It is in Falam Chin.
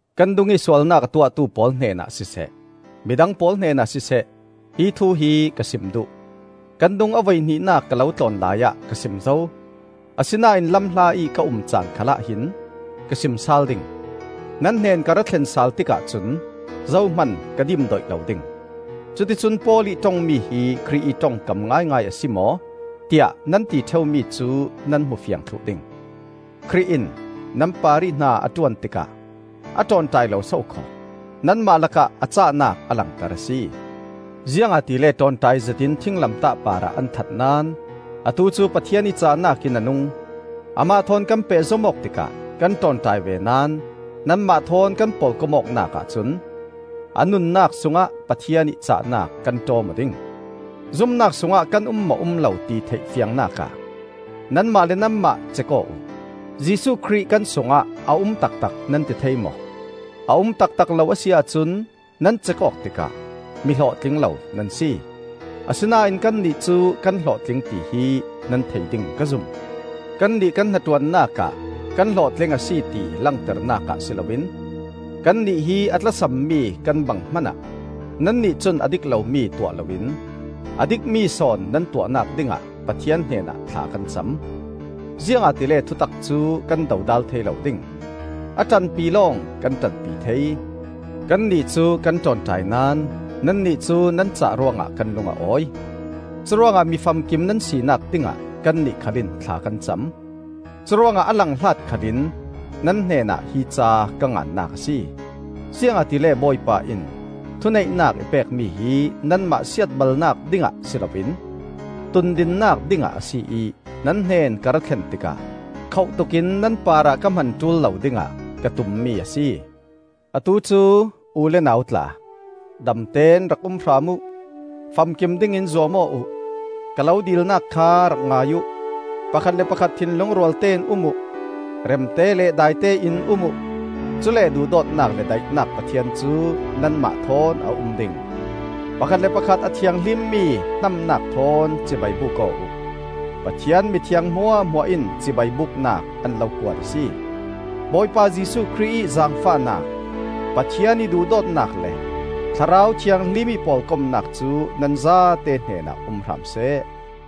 Kan dungih sualnak a tuahtu pawl hnenah siseh, midang pawl hnenah siseh, hi thu hi ka sim duh. Kan dung a voihnihnak ka lo tlawn laiah ka sim zo; asinain lamhla ih ka um caan khalah hin ka sim sal ding; nan hnen ka rathlen sal tikah cun zohman ka dimdoih lo ding. Cuticun Paul ih ṭongmi hi Khrih ih ṭongkam ngaingai a si maw? tiah nan ti ṭheumi cu nan hmu fiang thluh ding. Khrih in nan parih hna a ṭuan tikah a ṭawnṭai lo sokhaw; nanmah lakah a cahnak a langter a si. Ziangahtile ṭawnṭai zetin thinglamtah parah an that naón atu cu Pathian ih cahnak in a nung. Amah thawn kan pehzom awk tikah kan ṭawnṭai ve naón nanmah thawn kan pawlkomnak ahcun a nunnak sungah Pathian ih cahnak kan ṭawm aw ding. Zumnak sungah kan um maw um lo ti theih fiangnakah nanmah le nanmah cek aw uh. Jesuh Khrih kan sungah a um taktak nan ti thei maw? A um taktak lo a si ahcun nan cek awk tikah mi hlawhtling lo nan si. Asinain kannih cu kan hlawhtling tihi nan thei ding ka zum. Kannih kan hnaṭuannak ah kan hlawhtling a si ti langternak ah si loin, kannih hi a tlasammi kan bang hmanah nannih cun a dik lomi tuah loin a dikmi sawn nan tuahnak dingah Pathian hnenah thla kan cam. Ziangahtile thutak cu kan dodal thei lo ding; a ṭanpi lawng kan ṭanpi thei. Kannih cu kan ṭawnṭai naón nannih cu nan cah ruangah kan lung a awi. Curuangah mi famkim nan sinak dingah kannih khal in thla kan cam. Curuangah a langhlat khalin nan hnenah hi ca ka ngannak a si; ziangahtile Bawipa in thuneihnak i pek mi hi nanmah siatbalnak dingah si loin tundinnak dingah a si ih nan hnen ka ra thlen tikah khoh tukin nan parah ka hman ṭul lo dingah ka tummi a si. Atu cu u le nau tla, damteón rak um hram uh. Famkim dingin zuam aw uh. Ka lo dilnak kha rak ngai uh; pakhat le pakhat thinlung rualtein um uh; remte le daitein um uh. Cule duhdawtnak le daihnak Pathian cu nanmah thawn a um ding. Pakhat le pakhat a thianghlimmi hnamnak thawn cibai buk aw uh. Pathian mithiang hmuahhmuah in cibai buknak an lo kuat a si. Bawipa Jesuh Khrih ih zaangfahnak, Pathian ih duhdawtnak le Thlarau Thianghlim ih pawlkomnak cu nan zate hnenah um hram seh.